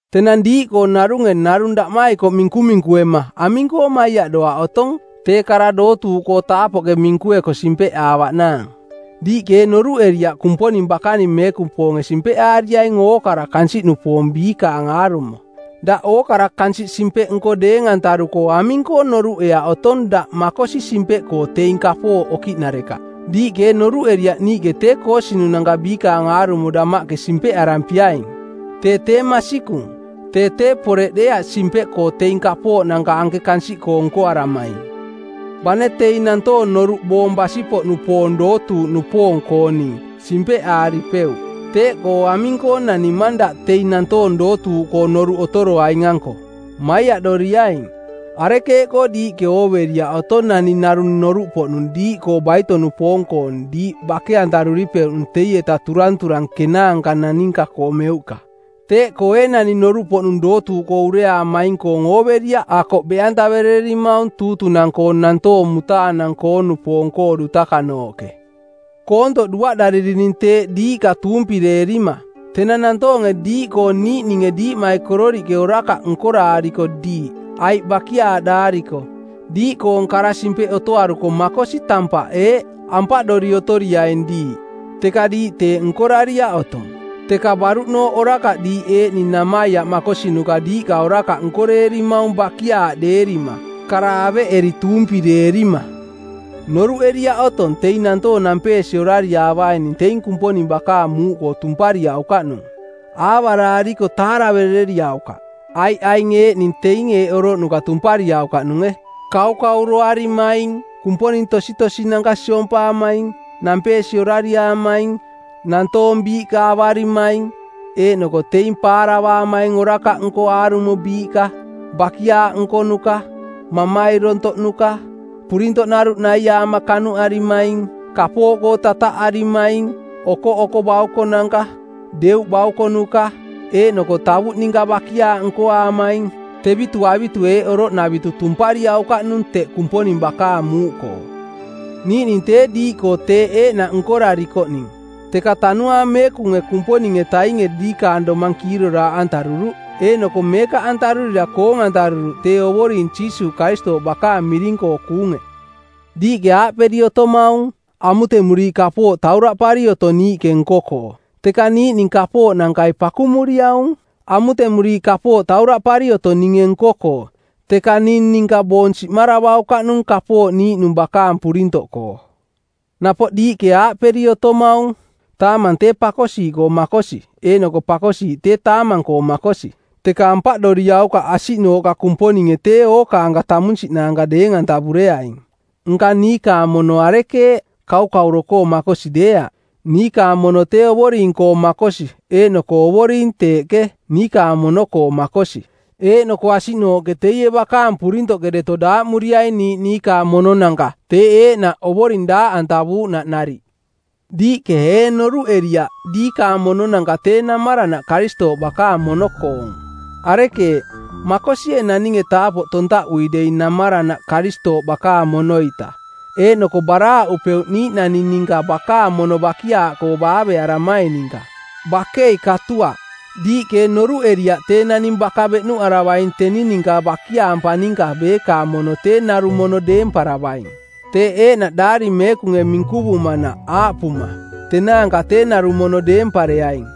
Tenang diiꞌkoo narunge narung daꞌmaikoꞌ minkuminkuema aming-koo maiaꞌdoaꞌ otong tee kara dootuuꞌkoo taapoꞌke minkueko simpeꞌaavaꞌnaang? Diiꞌke ee noruꞌeriaꞌ Kumponing bakaning meekupoonge simpeꞌaariaing ookara kansiꞌnupoong biikaang aarumo. Daꞌ ookara kansiꞌ simpeꞌnko˜ deeng-antaruko aming-koo noruꞌeaꞌ otong daꞌ makosi simpeꞌkoo teing kapooꞌ okiꞌnarekaꞌ? Diiꞌke ee noruꞌeriaꞌ niiꞌke tee koosinunanka biikaang aarumo damaꞌke simpeꞌarampiaing? Tee tee masikung. Tee tee poreꞌ deeaꞌ simpeꞌkoo teing kapooꞌnanka anke kansiꞌkoo nkoaramaing. Bane teing nantoong noruꞌ boong basi-poꞌnupoong dootuuꞌnupoong-kooning, simpeꞌ aaripeuꞌ! Teeꞌkoo aming-koo nanimang daꞌ teing nantoong dootuuꞌkoo noruꞌ otoroaing-anko? Maiaꞌdoriaing. Arekeeꞌkoo diiꞌke ooveriaꞌ otong naning narung noruꞌpoꞌnung diiꞌkoo baito-nupoong-koong diiꞌ bake-antaruripeuꞌnung teietaꞌ turanturang kenaanka naninka-koo meuꞌka? Teeꞌkoo ee naning noruꞌpoꞌnung dootuuꞌkoo ureaamaing-koong ooveriaꞌ akoꞌ beꞌantaverererimaung tuutunang-koo˜ nantoong mutaanang-koo-nupoong-koo dutakanooꞌke? Koontoꞌ duaꞌdaririning teeꞌ diiꞌka tuumpireerima. Tenang nantoonge diiꞌkoo niiꞌninge diiꞌmaikororiꞌke orakaꞌ nkoraariko diiꞌ, aiꞌ bakiaaꞌdaariko, diiꞌkoong kara-simpeꞌ otoaruko makosi tampaꞌ eeꞌ: Ampaꞌdori otoriaing diiꞌ. Teka diiꞌ teeꞌ nkorariaꞌ otong; teka baruꞌnooꞌ orakaꞌ diiꞌ eeꞌning namaiaꞌ makosinuka diiꞌka orakaꞌ nkoreerimaung bakiaaꞌdeerima kara aveꞌeri tuumpireerima. Noruꞌeriaꞌ otong teing nantoong nampeesi orariaavaining teing Kumponing bakaang muuꞌkoo tumpariaukaꞌnung? Aavaraariko taaraverereriaukaꞌ. Aiꞌ aing eeꞌning teing eeꞌ oroꞌnuka tumpariaukaꞌnunge: Kaukauroarimaing, kumponing tositosinanka siompaamaing, nampeesi orariaamaing, nantoong biiꞌka avarimaing eeꞌnoko teing paaravaamaing orakaꞌnko aarumo biiꞌka, bakiaaꞌ nkonuka, mamairontoꞌnuka, purintoꞌnaruꞌ naiaama kanuꞌarimaing, kapooꞌkoo tataꞌarimaing, okoꞌoko baukonanka, deuꞌ baukonuka, eeꞌnoko tavuꞌ ninka bakiaaꞌ nkoaamaing. Tevitu avitu eeꞌ oroꞌnavitu tumpariaukaꞌnung teꞌ Kumponing bakaang muuꞌkoo. Niiꞌning tee diiꞌkoo teeꞌ eeꞌnaꞌ nkorarikoꞌning, teka Tanuaang Meekunge Kumponing-etainge diikaang domang kiiroraaꞌantaruruꞌ, eeꞌnoko meekaꞌantarurira koong-antaruruꞌ tee Ovoring Jiisuuꞌ Karistooꞌ bakaang miring-koo kuunge. Diiꞌke aaꞌperi otomaung, “Amutemuriiꞌ kapooꞌ tauraꞌpari otong niiꞌke nko-koo.” Teka niiꞌning kapooꞌnankai pakumuriaung. Amutemuriiꞌ kapooꞌ tauraꞌpari otong ninge nko-koo, teka ning ninka boong siꞌmaravaukaꞌnung kapooꞌ niiꞌnung bakaang purintoꞌkoo. Napoꞌ diiꞌke aaꞌperi otomaung, “Taamang tee pakosiiꞌkoo makosi eeꞌnoko pakosiiꞌ tee taamang-koo makosi.” Teka ampaꞌdoriaukaꞌ asiꞌnooꞌka Kumponinge tee ookaanka tamunsiꞌnaanka deeng-antavureaing. Nka niikaang mono arekeeꞌ? Kaukauro-koo makosi deeaꞌ. Niikaang mono tee Ovoring-koo makosi eeꞌnoko Ovoring teeꞌke, niikaang mono-koo makosi. Eeꞌnoko asiꞌnooꞌke teie bakaang purintoꞌke deto daaꞌmuriaing niiꞌ niikaang mononanka teeꞌ eeꞌnaꞌ Ovoring daaꞌantavuuꞌnaꞌ nariꞌ. Diiꞌke ee noruꞌeriaꞌ diikaang mononanka tee namaranaꞌ Karistooꞌ bakaang mono-koong? Arekeeꞌ, makosie naninge taapoꞌ tontaꞌui dei namaranaꞌ Karistooꞌ bakaang mono-ita eeꞌnoko baraaꞌupeuꞌ niiꞌnani ninka bakaang mono bakiaaꞌkoo baavearamai ninka? Bakei katuaꞌ! Diiꞌke ee noruꞌeriaꞌ tee naning baka beꞌnuꞌaravaing teni ninka bakiaampa ninka beekaang mono tee narung mono deemparavaing? Teeꞌ eeꞌnaꞌ Daari Meekunge minkuvumanaꞌ aaꞌpuma, “Tenaanka tee narung mono deempareaing.”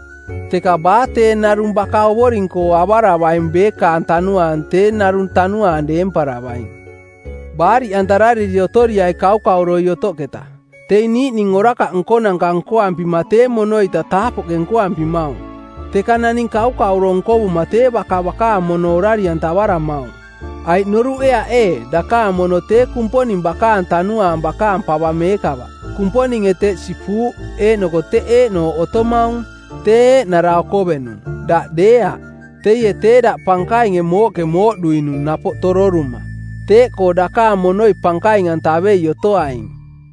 Teka baa tee narung baka Ovoring-koo avaravaing beekaang tanuaang tee narung tanuaang deemparavaing. Baariꞌantarariri otoriai kaukauroi otoꞌketa. Teing niiꞌning orakaꞌ nkonanka nkoampima tee mono-ita taapoꞌke nkoampimaung, teka naning kaukauro nkovuma tee baka bakaang mono orari-antavaramaung. Aiꞌ noruꞌeaꞌ ee dakaang mono tee Kumponing bakaang Tanuaang bakaang pava meekava? Kumponinge teꞌ sipuuꞌ eeꞌnoko teꞌ eeꞌnooꞌ otomaung. Tee eeꞌnara okovenung, daꞌ deeaꞌ. Teie tee daꞌ pankainge mooꞌke mooꞌduinung napoꞌ tororuma. Teeꞌkoo dakaang monoi pankaing-antavei otoaing.